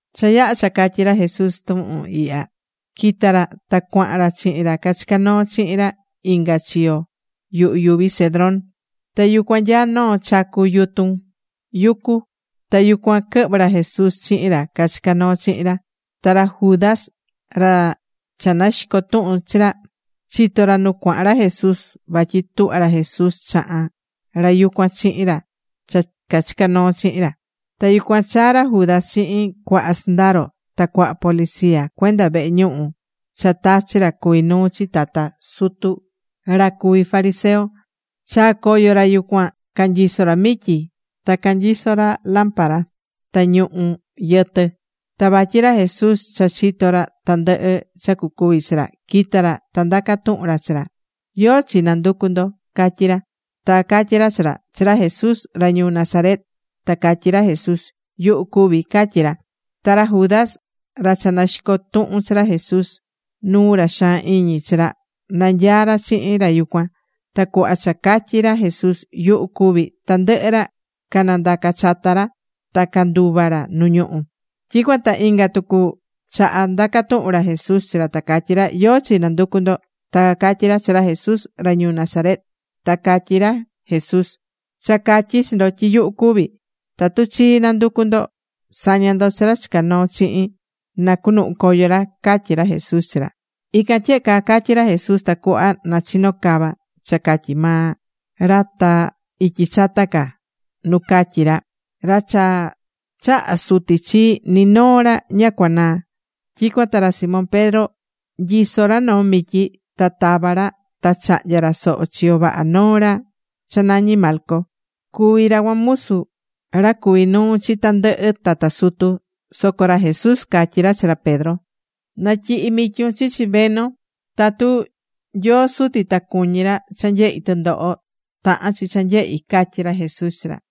Cha yaha̱ cha catyi̱ ra Jesús tuhun ihya, quita̱ ra ta cuahan ra chihin ra cachicá noo chihin ra inga chiyo yuhu yuvi Cedrón. Ta yucuan nyaá noo chacu yutun yucu. Ta yucuan quɨhvɨ̱ ra Jesús chihin ra cachicá noo chihin ra. Ta ra Judas, ra cha naxicó tuhun chi ra, chitó ra nu cuahan ra Jesús. Vatyi tuhvá ra Jesús chahán ra yucuan chihin ra cha cachicá noo chihin ra. Ta yucuan chaa̱ ra Judas chihin cuaha sɨndaro ta cuaha policía cuenda vehe ñuhu cha tachi̱ ra cuví nuu chi tata sutu ta ra cuví fariseo. Chaa̱ coyo ra yucuan, canyisó ra mityi, ta canyiso ra lámpara ta ñuhu̱ yɨtɨ. Ta vatyi ra Jesús cha chitó ra tandɨhɨ cha cucuvi chi ra, quita̱ ra ta ndaca̱ tuhun ra chi ra: ―¿Yóó chi nanducú ndo? ―catyí ra. Ta cacatyí ra chi ra: ―Chi ra Jesús ra ñuu Nazaret. Ta catyí ra Jesús: ―Yuhu cuví ―catyí ra. Ta ra Judas, ra cha naxicó tuhun chi ra Jesús nuu ra xaan iñi chi ra, nanyaá ra chihin ra yucuan. Ta cuhva cha catyi̱ ra Jesús: “Yuhu cuví”, tandɨhɨ ra canandaca̱ chata ra ta canduva̱ ra nu ñuhú. Tyicuan ta inga tucu chaha ndaca̱ tuhun ra Jesús chi ra, ta catyí ra: ―¿Yóó chi nanducú ndo? Ta cacatyí ra: ―Chi ra Jesús ra ñuu Nazaret. Ta catyí ra Jesús: ―Cha catyi̱ chi ndo tyi yuhu cuví. Tatu chii nanducú ndo, sa̱ña ndo chi ra chica noo chihin na cunuhun coyo ra ―catyí ra Jesús chi ra. Ican tyehe caa catyi̱ ra Jesús tacuhva na chino cava cha catyi̱ maa ra ta ityi chata ca nu catyí ra: “Ra cha chaha̱ Suti chii, ni noo ra ña cuanaá.” Tyicuan ta ra Simón Pedro nyisó ra noo mityi. Ta tava̱ ra ta chahnya̱ ra soho chiyo vaha noo ra cha nañí Malco. Cuví ra cuan musu ra cuví nuu chi tandɨhɨ tata sutu. Soco ra Jesús catyí ra chi ra Pedro: ―Na̱tyihi mityun chichi veno. Tatu Nyoo Suti ta cuñí ra cha nyehi tɨndoho, tahán chi cha nyehi ―catyí ra Jesús chi ra.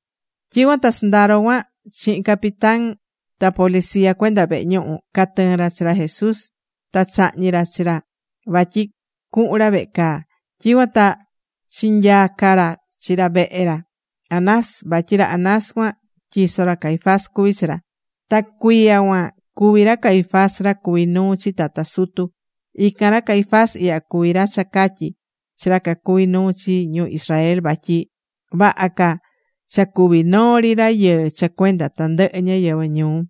Tyicuan ta sɨndaro cuan chihin capitán ra, ta policía cuenda vehe ñuhu, catɨɨ̱n ra chi ra Jesús, ta chahñi̱ ra chi ra vatyi cuhun ra vehe caa. Tyicuan ta chinyaca̱ ra chi ra vehe ra Anás, vatyi ra Anás cuan tyiso ra Caifás cuví chi ra. Ta cuiya cuan cuví ra Caifás ra cuví nuu chi tata sutu. Ican ra Caifás ihya cuví ra cha catyi̱ chi ra cacuví nuu chi ñu Israel vatyi vaha ca cha cúvi noo ri rayɨɨ cha cuenda tandɨhɨ ñáyɨvɨ ñuu.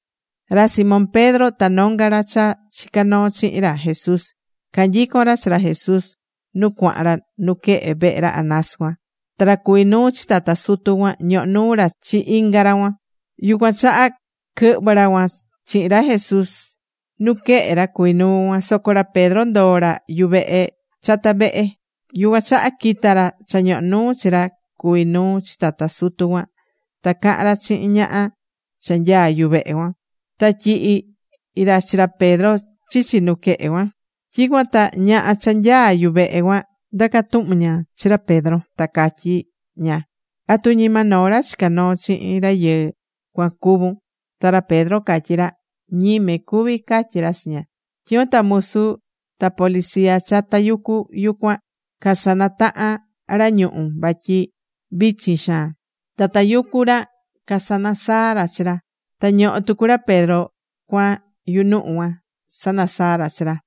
Ra Simón Pedro ta nonga ra cha chica̱ noo chihin ra Jesús, canyicón ra chi ra Jesús nu cuahan ra nuquehe vehe ra Anás cuan. Ta ra cuvi̱ nuu chi tata sutu cuan ñohó nuu ra chi inga ra cuan. Yucuan chaha quɨhvɨ̱ ra cuan chihin ra Jesús nuquehe ra cuví nuu cuan. Soco ra Pedro ndoo̱ ra yuvehe chata vehe. Yucuan chaha quita̱ ra cha ñohó nuu chi ra cuvi̱ nuu chi tata sutu cuan, ta caha̱n ra chihin ñaha cha nyaá yuvehe cuan. Ta tyihi̱ ra chi ra Pedro chichi nuquehe cuan. Tyicuan ta ñaha cha nyaá yuvehe cuan ndaca̱ tuhun ña chi ra Pedro, ta catyí ña: ―¿Atu ñima noo ra chica̱ noo chihin rayɨɨ cuan cuvún? Ta ra Pedro catyí ra: ―Ñime cuví ―catyí ra chi ña. Tyicuan ta musu ta policía cha tayucú yucuan, casanataha̱n ra ñuhu̱ vatyi vichin xaan. Ta tayucú ra casanasaá ra chi ra. Ta ñohó tucu ra Pedro cuan yunuhu cuan, sanasaá ra chi ra.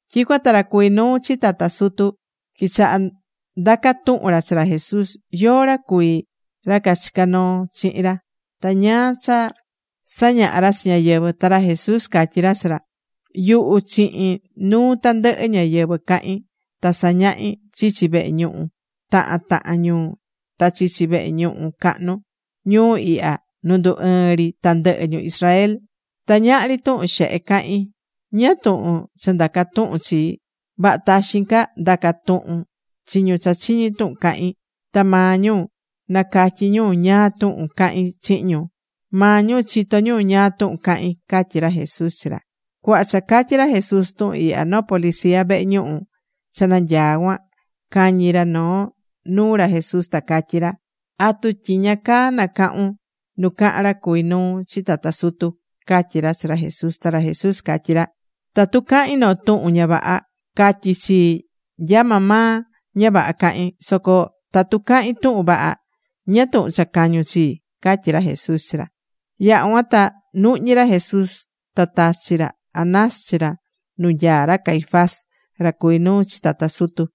Tyicuan ta ra cuvi̱ nuu chi tata sutu quichaha̱ ndaca tuhun ra chi ra Jesús, yóó ra cuví ra cachicá noo chihin ra, ta ñáá cha sañahá ra chi ñáyɨvɨ. Ta ra Jesús catyí ra chi ra: ―Yuhu chihin nuu tandɨhɨ ñáyɨvɨ cahín. Ta sañahi̱ chichi vehe ñuhu tahan tahan ñuu ta chichi vehe ñuhu cahnu ñuu ihya nu ndu ɨɨ́n ri tandɨhɨ ñu Israel. Ta ñahri tuhun xehe cahín. ¿Ñáá tuhun cha ndacá tuhun chii? Vaha taxin ca nda̱ca tuhun chi ñu cha chiñi̱ tuhun cahi̱n, ta maa ñu nacatyi ñu ñáá tuhun cahi̱n chihin ñu. Maa ñu chitó ñu ñáá tuhun cahi̱n ―catyí ra Jesús chi ra. Cuhva cha catyí ra Jesús tuhun ihya, noo policía vehe ñuhu cha nanyaá cuan, cañi̱ ra noo nuu ra Jesús ta catyí ra: ―¿Atu tyiña caa nacahún nu cahán ra cuvi̱ nuu chi tata sutu? ―catyí ra chi ra Jesús. Ta ra Jesús catyí ra: ―Tatu cahi̱n noo tuhun ña vaha, ca̱tyi chii nya maa maa ña vaha cahi̱n. Soco tatu cahi̱n tuhun vaha, ¿ñáá tuhun cha cañu̱n chii? ―catyí ra Jesús chi ra cuan. Yaha̱ cuan ta nuhñí ra Jesús, ta tachi̱ ra Anás chi ra nu nyaá ra Caifás, ra cuví nuu chi tata sutu.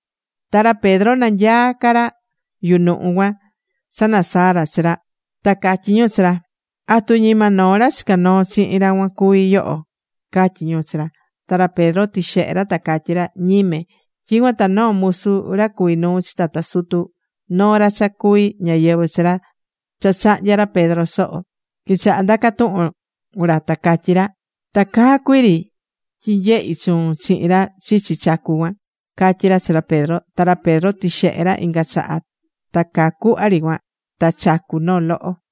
Ta ra Pedro nanyaá ca ra yunuhu cuan sanasaá ra chi ra. Ta catyi̱ ñu chi ra: ―¿Atu ñima noo ra chicá noo chihin ra cuan cuví yoho? ―catyí ñu chi ra. Ta ra Pedro tixehe̱ ra, ta catyí ra: ―Ñime. Tyicuan ta noo musu ra cuví nuu chi tata sutu, noo ra cha cuví ñáyɨvɨ chi ra cha chahnya̱ ra Pedro soho, quichaha̱ ndaca tuhun ra ta catyí ra: ―Ta caa cuiri tyi nyehi̱ chuun chihin ra chichi chacu cuan ―catyí ra chi ra Pedro. Ta ra Pedro tixehe̱ ra inga chaha, ta caa cuhva ri cuan ta chacu̱ noo loho.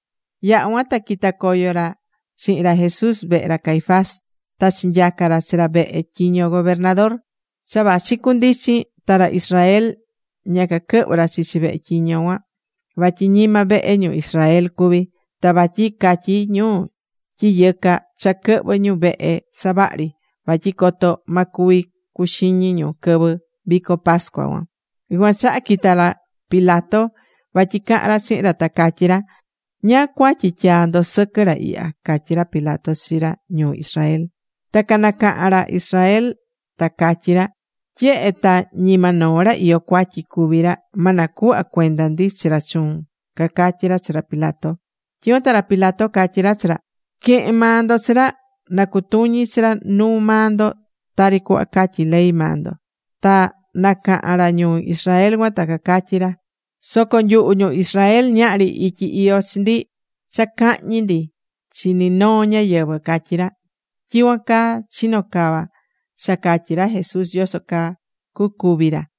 Yaha̱ cuan ta quita̱ coyo ra chihin ra Jesús vehe ra Caifás ta chinyaca̱ ra chi ra vehe tyiño gobernador. Cha vachi cundichin ta ra Israel ña caquɨhvɨ̱ ra chichi vehe tyiño cuan vatyi ñima vehe ñu Israel cuví. Ta vatyi catyí ñu tyi yɨca cha quɨhvɨ̱ ñu vehe savahri vatyi coto ma cuvi cuxiñi ñu quɨvɨ vico pascua cuan. Yucuan chaha quita̱ ra Pilato vatyi cahan ra chihin ra, ta catyi ra: ―¿Ñáá cuatyi tyaá ndo sɨquɨ ra ihya? ―catyí ra Pilato chi ra ñuu Israel. Ta canacaha̱n ra Israel ta catyí ra: ―Tyehe ta ñima noo ra iyó cuatyi cuví ra, ma nacuhva cuenda ndi chi ra chuun ―cacatyí ra chi ra Pilato. Tyicuan ta ra Pilato catyí ra chi ra: ―Que̱hen maa ndo chi ra, na cutuñi chi ra nuu maa ndo tari cuhva catyí ley maa ndo. Ta nacaha̱n ra ñuu Israel cuan ta cacatyí ra: ―Soco nyuhu ñu Israel ñahri ityi iyó chi ndi cha cahñi ndi chi ni noo ñáyɨvɨ ―catyí ra. Tyicuan caa chino̱ cava cha catyi̱ ra Jesús yoso caa cucúvi ra.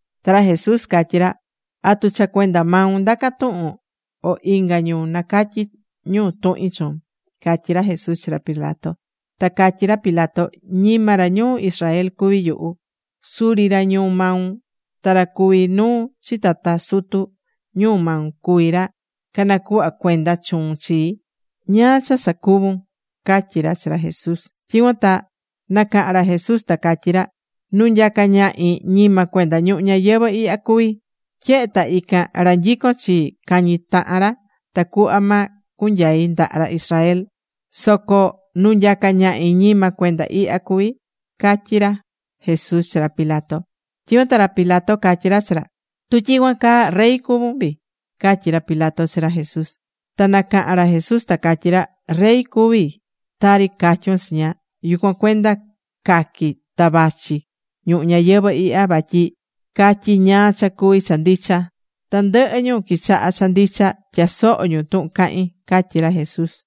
Ta ra Jesús catyí ra: ―¿Atu cha cuenda maun ndaca tuhun, o inga ñu nacatyi̱ ñu tuhin chuun? ―catyí ra Jesús chi ra Pilato. Ta catyí ra Pilato: ―Ñima ra ñuu Israel cuví yuhu. Suri ra ñuu maun ta ra cuví nuu chi tata sutu ñuu maun cuví ra canacuhva̱ cuenda chuun chii. ¿Ñáá cha sacuvu̱n? ―catyí ra chi ra Jesús. Tyicuan ta nacaha̱n ra Jesús ta catyí ra: ―Nu nyacá ñahi ñima cuenda ñuhu ñayɨvɨ̱ ihya cuví. Tyehe ta ican, ra nyicón chii cañi tahan ra tacuhva ma cunyai ndaha ra Israel. Soco nu nyacá ñahi, ñima cuenda ihya cuví ―catyí ra Jesús chi ra Pilato. Tyicuan ta ra Pilato catyí ra chi ra: ―¿Tu tyicuan caa, rey cuvún vii? ―catyí ra Pilato chi ra Jesús. Ta nacaha̱n ra Jesús ta catyí ra: ―Rey cuví tari catyun chiña. Yucuan cuenda caqui̱ ta vachi ñuhu ñayɨvɨ̱ ihya, vatyi catyi ñáá cha cuví cha ndicha. Tandɨhɨ ñu quichaha cha ndicha, tyasohó ñu tuhun cahín ―catyí ra Jesús.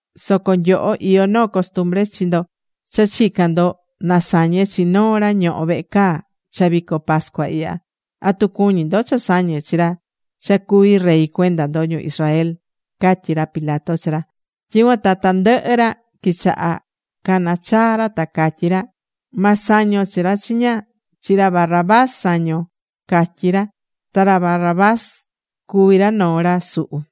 Soco nyoho iyó noo costumbre chi ndo cha chican ndo na sañe chi noo ra ñohó vehe caa cha vico pascua ihya. ¿Atu cuñí ndo cha sañe chi ra cha cuví rey cuenda ndo ñu Israel? ―catyí ra Pilato chi ra. Tyicuan ta tandɨhɨ ra quichaha̱ canachaa ra ta catyí ra: ―¡Ma sañon chi ra chiña! ¡Chi ra Barrabás sa̱ñon! ―catyí ra. Ta ra Barrabás cuví ra noo ra suhu.